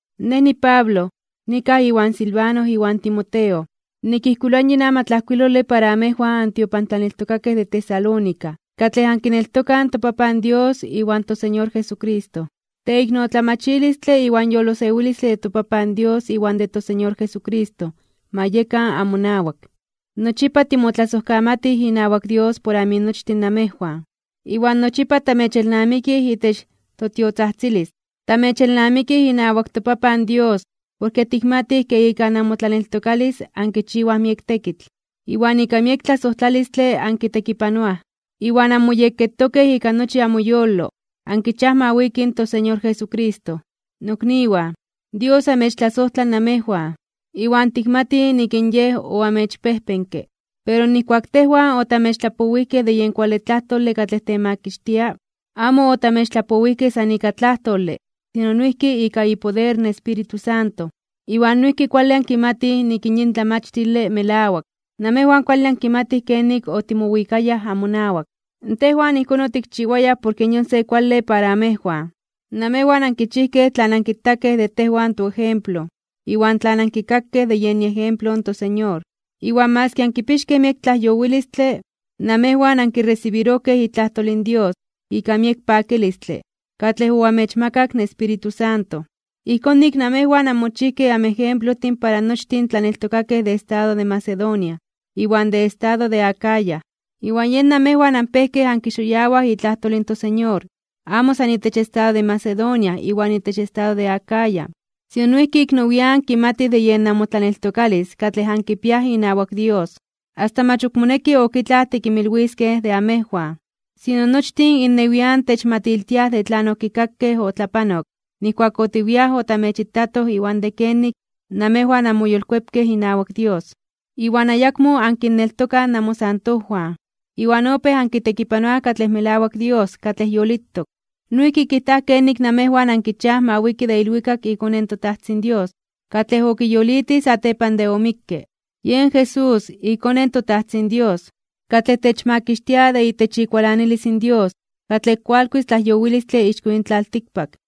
Nej niPablo. Nikaj iwan Silvano iwan Timoteo, nikijkuiloa yin amatlajkuilole para amejwan antiopantlaneltokakej de Tesalónica, katlej ankineltokaj in toPapan Dios iwan toSeñor Jesucristo. Teiknotlamachilistle iwan yolosewilistle de toPapan Dios iwan de toSeñor Jesucristo, ma yekan amonawak. Nochipa timotlasojkamatij inawak Dios por aminochtin namejwan, iwan nochipa tamechelnamikij itech totiotzajtzilis. Tamechelnamikij inawak toPapan Dios porke tikmatij ke ika namotlaneltokalis ankichiwaj miek tekitl, iwan ika miek tlasojtlalistle ankitekipanoaj, iwan anmoyekketokej ika nochi amoyolo ankichiaj ma wiki in toSeñor Jesucristo. Nokniwan, Dios amechtlasojtla namejwan, iwan tikmatij nik in Yej oamechpejpenke. Porke nijkuak tejwan otamechtlapowijkej de yen kuale tlajtole katlej temakixtia, amo otamechtlapowijkej san ika tlajtole, sino noijki ika ipoder in Espíritu Santo. Iwan noijki kuale ankimatij nik in yin tlamachtile melawak. Namejwan kuale ankimatij kenik otimowikayaj amowan. Tejwan ijkón otikchiwayaj porke yon se kuale para amejwan. Namejwan ankichijkej tlan ankitakej de tejwan toejemplo iwan tlan ankikakej de yen iejemplo in toSeñor. Iwan maski ankipixkej miek tlajyowilistle, namejwan ankiresibirojkej itlajtol in Dios ika miek pakilistle katlej oamechmakak in Espíritu Santo. Ijkón nik namejwan anmochijkej anmejemplojtin para nochtin in tlaneltokakej de estado de Macedonia iwan de estado de Acaya. Iwan yen namejwan anpejkej ankixoyawaj itlajtol in toSeñor amo san itech estado de Macedonia iwan itech estado de Acaya, sino noijki ik nowian (nian nepa) kimatij de yen namotlaneltokalis katlej ankipiaj inawak Dios. Asta mach ok moneki ok itlaj tikinmilwiskej de amejwan. Sino, nochtin innewian techmatiltiaj de tlan okikakej otlapanok nijkuak otiwiaj otamechitatoj iwan de kenik namejwan anmoyolkuepkej inawak Dios, iwan ayakmo ankinneltokaj namosantojwan, iwan opéj ankitekipanoaj katlej melawak Dios katlej yolitok. Noijki kijtaj kenik namejwan ankichiaj ma wiki de ilwikak iKone in toTajtzin Dios, katlej okiyolitij satepan de omikke. Yen Jesús, iKone in toTajtzin Dios, katlej techmakixtia de itech ikualanilis in Dios katlej kualkuis tlajyowilistle ixko yin tlaltikpak.